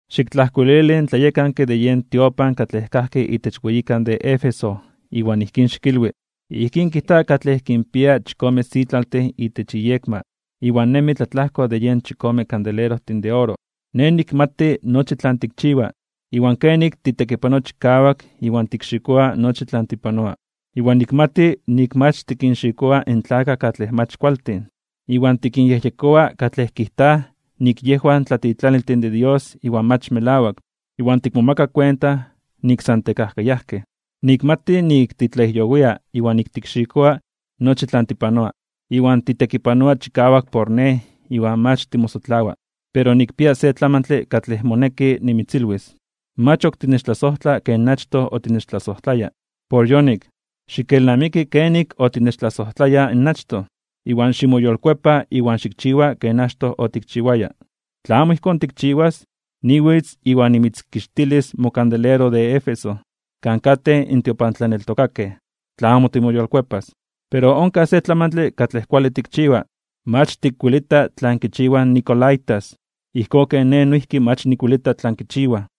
’Xiktlajkuilili in tlayekanke de yen tiopan katlej kajki itech weyikan de Éfeso iwan ijkín xikilwi: “Ijkín kijta katlej kinpia chikome sitlaltin itech iyekma, iwan nemi tlatlajko de yen chikome kandelerojtin de oro: Nej nikmati nochi tlan tikchiwa, iwan kenik titekipanoa chikawak iwan tikxikoa nochi tlan tipanoa. Iwan nikmati nik mach tikinxikoa in tlakaj katlej mach kualtin, iwan tikinyejyekoa katlej kijtaj nik yejwan tlatitlaniltin de Dios iwan mach melawak, iwan tikmomaka kuenta nik san tekajkayajkej. Nikmati nik titlajyowia iwan tikxikoa nochi tlan tipanoa, iwan titekipanoa chikawak por Nej iwan mach timosotlawa. Pero nikpia se tlamantle katlej moneki nimitzilwis. Mach ok tinechtlasojtla ken achtoj otinechtlasojtlaya. Por yonik, xikelnamiki kenik otinechtlasojtlaya in achtoj, iwan ximoyolkuepa iwan xikchiwa ken achtoj otikchiwaya. Tla amo ijkón tikchiwas, niwitz iwan nimitzkixtilis mokandelero de Éfeso kan katej in tiopantlaneltokakej, tla amo timoyolkuepas. Pero onkaj se tlamantle katlej kuale tikchiwa: mach tikwelita tlan kichiwaj in nicolaítas, ijkón ken Nej noijki mach nikwelita tlan kichiwaj.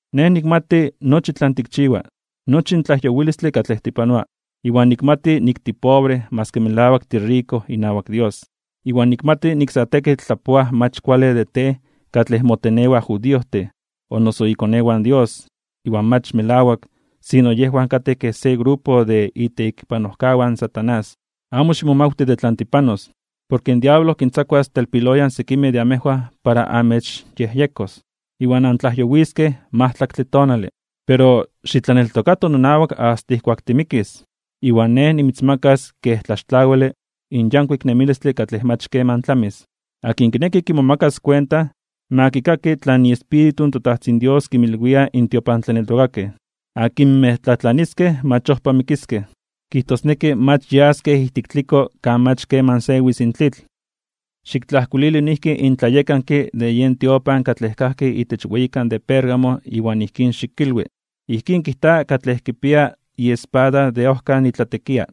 Nej nikmati nochi tlan tikchiwa, nochi in tlajyowilistle katlej tipanoa, iwan nikmati nik tipobre maski melawak tiriko inawak Dios. Iwan nikmati nik sa tekitl tlapoaj mach kuale de tej katlej motenewaj judiojtin, o noso ikonewan Dios, iwan mach melawak sino yejwan katej kej se grupo de itekipanojkawan in Satanás. Amo ximomawti de tlan tipanos. Porke in diablo kintzakuas telpiloyan sekimej de amejwan para amechyejyekos, iwan antlajyowiskej majtlaktle tonale. Pero xitlaneltokato nonawak asta ijkuak timikis, iwan Nej nimitzmakas kej tlaxtlawile in yankuik nemilistle katlej mach keman tlamis. Akin kineki kimomakas kuenta, ma kikaki tlan iEspíritu in toTajtzin Dios kinmilwia in tiopantlaneltokakej. Akinmej tlatlaniskej mach ojpa mikiskej, kijtosneki mach yaskej ijtik tliko kan mach keman sewis in tlitl.” ’Xiktlajkuilili noijki in tlayekanke de yen tiopan katlej kajki itech weyikan de Pérgamo iwan ijkín xikilwi: “Ijkín kijta katlej kipia iespada de ojkan itlatekia: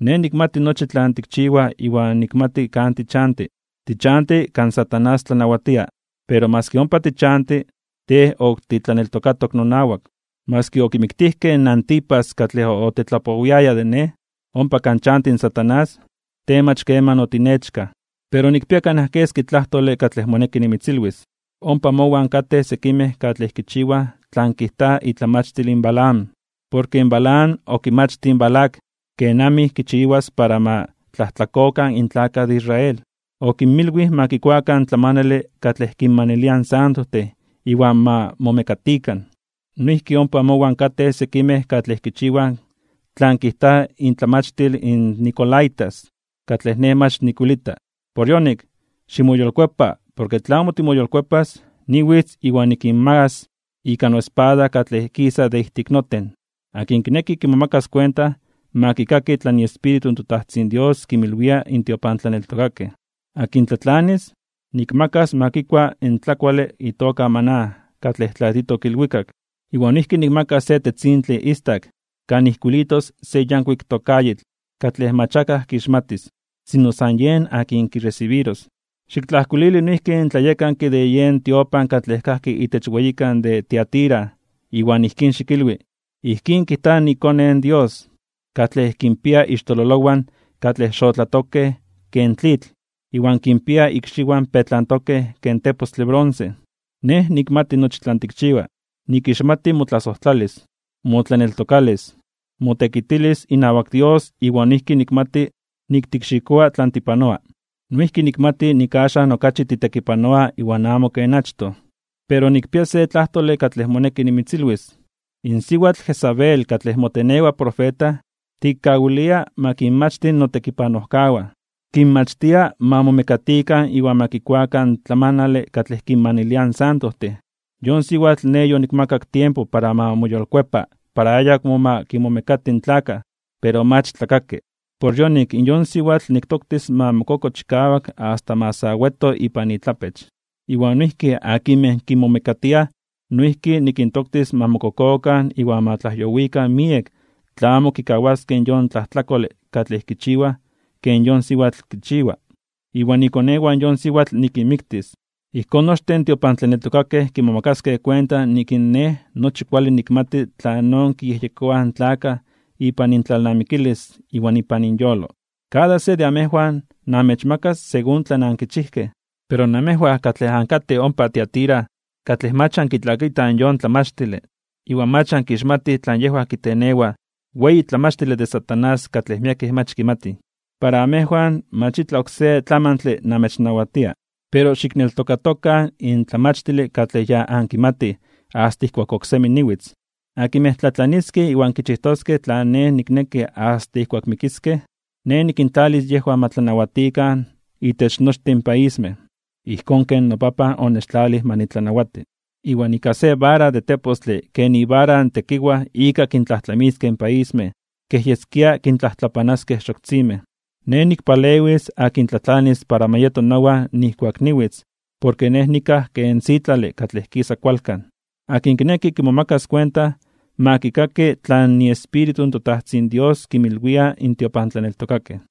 Nej nikmati nochi tlan tikchiwa iwan nikmati kan tichanti. Tichanti kan Satanás tlanawatia, pero maski ompa tichanti, tej ok titlaneltokatok nonawak. Maski okimiktijkej in Antipas katlej otetlapowiaya de Nej, ompa kan chanti Satanás, tej mach keman otinechkaj. Pero nikpia kanaj keski tlajtole katlej moneki nimitzilwis. Ompa mowan katej sekimej katlej kichiwaj tlan kijta itlamachtil in Balaam. Porke in Balaam okimachtij in Balac kenamij kichiwas para ma tlajtlakokan in tlakaj de Israel. Okinmilwij ma kikuakan in tlamanale katlej kinmanilia in santojtin iwan ma momekatikan. Noijki ompa mowan katej sekimej katlej kichiwaj tlan kijta intlamachtil in nicolaítas, katlej Nej mach nikwelita. Por yonik, ximoyolkuepa porke tla amo timoyolkuepas, niwitz iwan nikinmagas (nikinmakas) ika noespada katlej kisa de ijtik noten. Akin kineki kimomakas kuenta, ma kikaki tlan iEspíritu in toTajtzin Dios kinmilwia in tiopantlaneltokakej. Akin tlatlanis, nikmakas ma kikua in tlakuale itoka maná katlej tlatitok ilwikak. Iwan noijki nikmakas se tetzintle istak kan ijkuilitos se yankuik tokayitl (tokayotl) katlej mach akaj kixmatis, sino san yen akin kiresibiros.” ’Xiktlajkuilili noijki in tlayekanke de yen tiopan katlej kajki itech weyikan de Tiatira iwan ijkín xikilwi: “Ijkín kijta iKone in Dios, katlej kinpia ixtololowan katlej xotlatokej ken tlitl iwan kinpia ikxiwan petlantokej ken tepostle bronce: Nej nikmati nochi tlan tikchiwa. Nikixmati motlasojtlalis, motlaneltokalis, motekitilis inawak Dios iwan noijki nikmati nik tikxikoa tlan tipanoa. Noijki nikmati nik axan okachi titekipanoa iwan amo ken achtoj. Pero nikpia se tlajtole katlej moneki nimitzilwis. In siwatl Jezabel katlej motenewa profeta, tikkawilia ma kinmachti notekipanojkawan. Kinmachtia ma momekatikan iwan ma kikuakan in tlamanale katlej kinmaniliaj in santojtin. Yon siwatl Nej yonikmakak tiempo para ma moyolkuepa para ayakmo ma kinmomekati in tlakaj, pero mach tlakaki. Por yonik, in yon siwatl niktoktis ma mokoko chikawak asta ma sa weto ipan itlapech, iwan noijki akinmej kinmomekatia noijki nikintoktis ma mokokokan iwan ma tlajyowikan miek tla amo kikawaskej yon tlajtlakole katlej kichiwaj ken yon siwatl kichiwa. Iwan ikonewan in yon siwatl nikinmiktis. Ijkón, nochtin in tiopantlaneltokakej kimomakaskej kuenta nik in Nej nochi kuale nikmati tlanon kiyejyekoaj in tlakaj ipan intlalnamikilis iwan ipan inyolo. Iwan kada se de amejwan namechmakas según tlan ankichijkej. Pero namejwan katlej ankatej ompa Tiatira, katlej mach ankitlakitaj yon tlamachtile iwan mach ankixmatij tlan yejwan kitenewaj weyi tlamachtile de Satanás katlej miekej mach kimatij, para amejwan mach itlaj oksé tlamantle namechnawatia. Pero xikneltokatokan in tlamachtile katlej ya ankimatij asta ijkuak oksemi niwitz. Akinmej tlatlaniskej iwan kichijtoskej tlan Nej nikneki asta ijkuak mikiskej, Nej nikintlalis yejwan ma tlanawatikan itech nochtin in paismej ijkón ken noPapan onechtlalij ma nitlanawati. Iwan ika se vara de tepostle ken ivara in tekiwaj ika kintlajtlamiskej in paismej, kej yeskia kintlajtlapanaskej xoktzinmej. Nej nikpalewis akin tlatlanis para ma yeto nowan nijkuak niwitz, porke Nej nikaj ken sitlale katlej kisa kualkan. Akin kineki kimomakas kuenta, ma kikaki tlan iEspíritu in toTajtzin Dios kinmilwia in tiopantlaneltokakej.”